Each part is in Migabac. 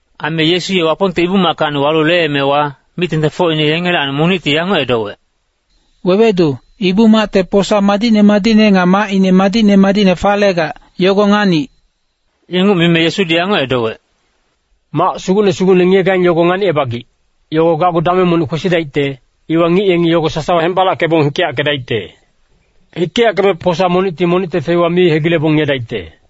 Aime Yesu ye Wapongte Ibu-mackacni walu leemewa, mic-tengtengfocine yengelacni monicti yanguc edowec, “Wewedu, Ibu-macte posa madicne madicne nga macine madicne madicne falegac, yogo nganic.” Inguc mime Yesudi yanguc edowec, “Mac sugucne sugucne ngiyegaing yogo nganicebagic, yogo gacgu dameng monic kwesidaicte, yogowa ngic yengi yogo sasawa hembalackebong hikeyackedaicte. Hikeyackeme posa monicti monicte feiwa mi hegilebong ngiyedaicte.”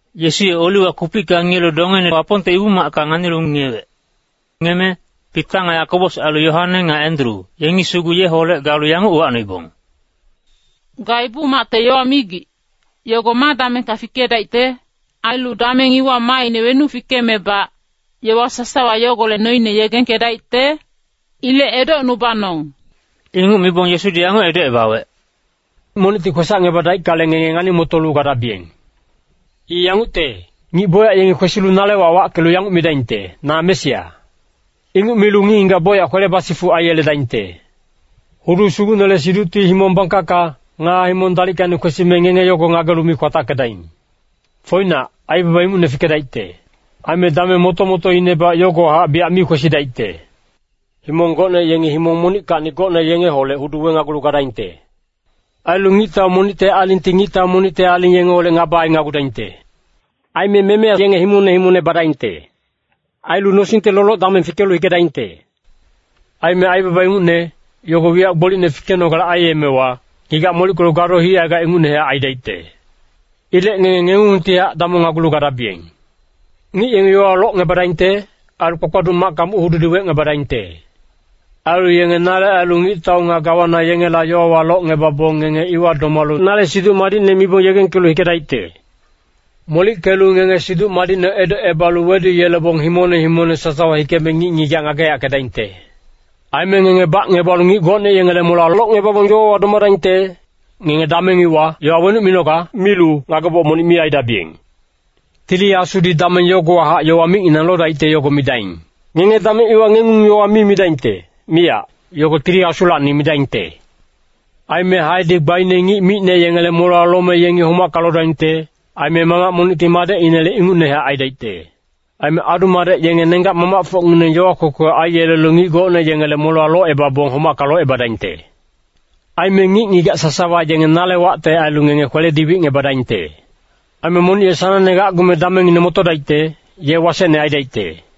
Yesu ye Oliwa kupicka ngiyelu dongeine Wapongte Ibu-macka nganilu ngiyewec. Ngiyeme Pita nga Yakobos ailu Yoane nga Endru, yengi sugu yeholec galu yanguc uwacnoibong, “Ga Ibu-macte yowa migic, yogo ma damengka fikedaicte? Ailu dameng iwa maaine wenuc fikemebac, yowa sasawa yogolec noine yegengkedaicte? Ilec edocnubanong.” Inguc mibong Yesudi yanguc edocebawec, “Monicti kwesacngebadaickale, ngenge ngani-motolu gadabiyeng. I yangucte, ngic bocyac yengi kwesilu nale wac wackelu yanguc midaingte, ‘Na Mesia.’ Inguc milu ngic-ngigac bocyac kwele basifuc aiyeledaingte. “Hudu sugucnele siducti himong bangkacka, nga himong dalickacni kwesime ngenge yogo ngagelu mi kwatackedaing. Foinac, aibaba ingucne fikedaicte. Aime dameng moto-motoinebac yogowahac biyac mi kwesidaicte. Himong gocne yengi himong monickacni gocne yengeholec hudu wenagulu gadaingte. Ailu ngictau monicte alingti ngictau monicte aling yengeholec ngaba ainagudaingte. Aime memeya yenge himongne himongne badaingte. Ailu nosingte loloc-dameng fikelu hikedaingte. Aime aibaba ingucne, yogo wiyac gbolicne fikenogale aiyemewa, ngigac molickelu gado hicaigac, ingucnehac aidaicte. Ilec ngenge ngengungtihac damongnagulu gadabiyeng. Ngic yengi yowawa locngebadaingte. Ailu kpakpaduc macka muc-hududi wecngebadaingte. Ailu yenge nale ailu ngictau nga gawana yengela yowawa locngebabong, ngenge iwa domalu nale Siduc Madicne mibong yegengkelu hikedaicte. “Molickelu ngenge Siduc Madicne edocebalu weduyelebong himongne himongne sasawa hikeme ngic-ngigac ngageyackedaingte. Aime ngenge bacngebalu ngic gocne yengele molewa locngebabong yowawa domadaingte, ngenge dameng iwa, ‘Yowa wenuc minoga?’ milu ngageboc monic mi aidabiyeng. Tili Asudi dameng yogowahac yowa micnginang lodaicte yogo midaing. Ngenge dameng iwa ngengung-yowa mi midaingte, miyac. Yogo Tili Asulacni midaingte. Aime haedi gbaine ngic micne yengele molewa lome yengi homacka lodaingte. Aime mamac monicti madecinele ingucnehac aidaicte. Aime adu-madec yengi nenggac-mamacfocngineng yowa kwekwe aiyelelu ngic gocne yengele molewa locebabong homacka locebadaingte. Aime ngic-ngigac sasawa yenge nale wacte ailu ngenge kweledi wicngebadaingte. Aime monic ye sanangnehac gacgume damengine motodaicte, ye wasecne aidaicte.”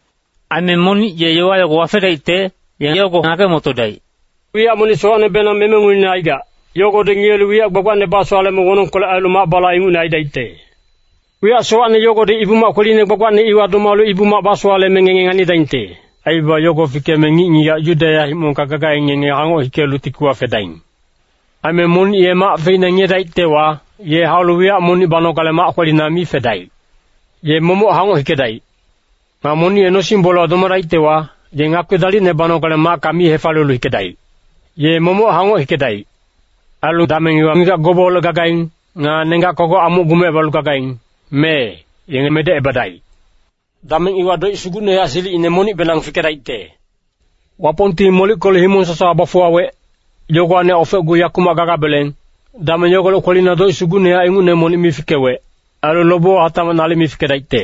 Aime monic ye yowa yago wafedaicte, ye yogo ngage-motodaic. “Wiyac monic sowacnebenang memenguine aigac, yogodi ngiyelu wiyac gbagbacnebasowaleme wonongkolec ailu mac-bala ingucne aidaicte. Wiyac sowacne yogodi Ibu-mac kweline gbagbacne iwa domalu Ibu-mac basowaleme ngenge nganidaingte. Aibaba yogo fikeme ngic-ngigac Yudeya himongka gagaing, ngenge hangoc hikelu tikiwa fedaing. Aime monic ye mac feina ngiyedaictewa, ye haulu wiyac monic banogale mac kwelina mi fedaic. Ye momoc hangoc hikedaic. Nga monic ye nosing-bolewa domadaictewa, ye ngakpi dalicne banogale macka mi hefaliyelu hikedaic. Ye momoc hangoc hikedaic. Ailu dameng iwa ngigac gobeholec gagaing, nga nenggac kogoc amuc gumecebalu gagaing, mee, yenge medecebadaic. “Dameng iwa doic sugucnehac silicine monicbenang fikedaicte. Wapongti molickelu himong sasawa bafuwawec, yogowacnihac ofecgu yakumac gagabeleng, dameng yogolec kwelina doic sugucnehac ingucne monic mi fikewec. Ailu lobewa hatacmac nalic mi fikedaicte.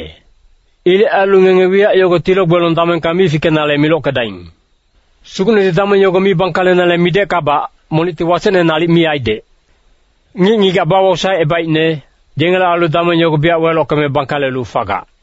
Ilec ailu ngenge wiyac yogo tilo-gbelong damengka mi fikenale milockedaing. Sugucnedi dameng yogo mi bangkalenale mideckabac, monicti wasecne nalic mi aidec. Ngic-ngigac bawosaecebaicne, yengele ailu dameng yogo biyac welockeme bangkalelu fagac.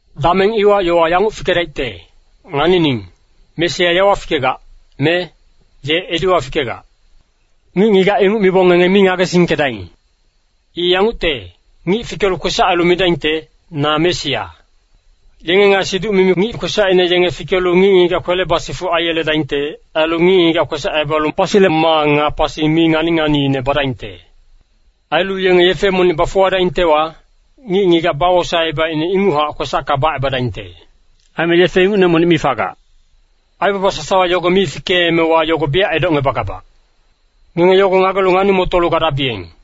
“Dameng iwa yowa yanguc fikedaicte, ‘Nganining, Mesia yawa fikegac,’ me, ‘Ye ediwa fikegac.’ Ngic-ngigac inguc mibong ngenge mi ngagesingkedaing. I yangucte, ngic fikelu kwesac ailu midaingte, ‘Na Mesia.’ Yenge nga siduc-mimi ngic kwesacine yenge fikelu ngic-ngigac kwele basifuc aiyeledaingte. Ailu ngic-ngigac kwesacebalu pasile maa nga pasi mi ngani-nganiine badaingte. Ailu yenge yefe monic bafuwadaingtewa, ngic-ngigac bawosaecebaicne inguchac kwesacka bacebadaingte, aime yefe ingucne monic mi fagac. Aibaba sasawa yogo mi fikeemewa yogo biyac edocngebagabac. Ngenge yogo ngagelu ngani-motolu gadabiyeng.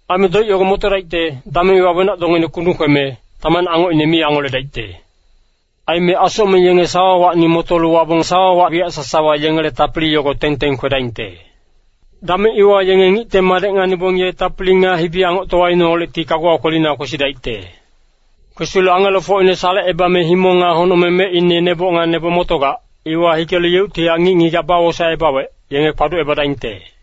“Aime doic yogo motodaicte, dameng iwa ‘Wenac-dongeine kundung kweme, tamacne angocine mi angoledaicte. Aime asocmeng yenge sawawacni motolu wabong sawawa wiyac sasawa yengele tapili yogo teng-teng kwedaingte.’ Dameng iwa yenge Ngicte Madec nganibong ye tapili nga hibi-angoctowaineholecti kaguwa kwelina kwesidaicte. Kwesilu angelofocine salecebame himong nga honocmeng mecine neboc nga neboc motogac, iwa hikelu yeuctihac ngic-ngigac bawosaecebawec, yenge kpaducebadaingte.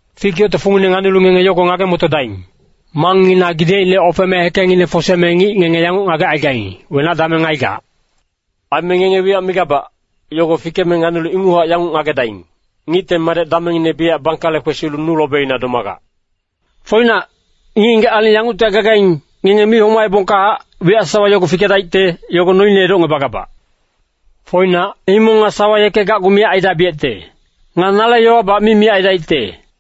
“Fik yocte fungine nganilu ngenge yogo ngage-motodaing. Mangngina gidecine ofeme hekengngine foseme ngic ngenge yanguc ngagecaigaing, wenac dameng aigac. Aime ngenge wiyac migabac, yogo fikeme nganilu inguchac yanguc ngagedaing, Ngicte Madec damengngine biyac bangkale kwesilu nu lobina domagac. Foinac, ngic-ngigac aling yanguctihac gagaing, ngenge mi homaebongkahac, wiyac sasawa yogo fikedaicte, yogo noine edocngebagabac. Foinac, himong nga sawa yeke gacgu miyac aidabiyecte. Nga nale yowabac mi miyac aidaicte.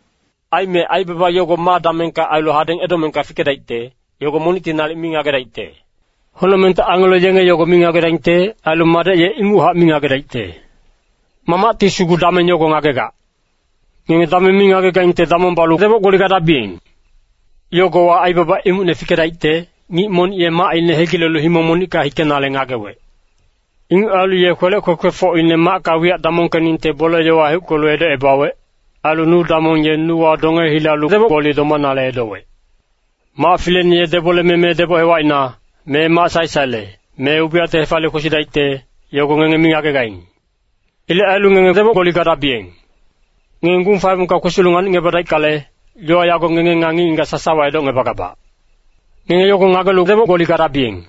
“Aime aibaba yogo ma damengka ailu hadeng edomengka fikedaicte, yogo monicti nalic mi ngagedaicte. Honocmengte angelo yenge yogo mi ngagedaingte. Ailu Madec ye inguchac mi ngagedaicte. Mamacti sugu dameng yogo ngagegac. Ngenge dameng mi ngagegaingte damong balu deboc-gboli gadabiyeng. “Yogowa aibaba ingucne fikedaicte, ngic monic ye macine hegilelu himong monicka hikenale ngagewec. Inguc ailu ye kwelec kwekwefocine macka wiyac damongkeningte bole-yowa heuckelu edocebawec. Ailu nu damong ye nuwa donge hilalu deboc-gboli domanale edowec. Mac fileine ye deboleme me deboc hewacina, me mac sae-saele, me ubiyacte hefaliyelu kwesidaicte, yogo ngenge mi ngagegaing. Ilec ailu ngenge deboc-gboli gadabiyeng. Ngenge gung faebongka kwesilu nganicngebadaickale, yowa yago ngenge nga ngic-ngigac sasawa edocngebagabac. Ngenge yogo ngagelu deboc-gboli gadabiyeng.”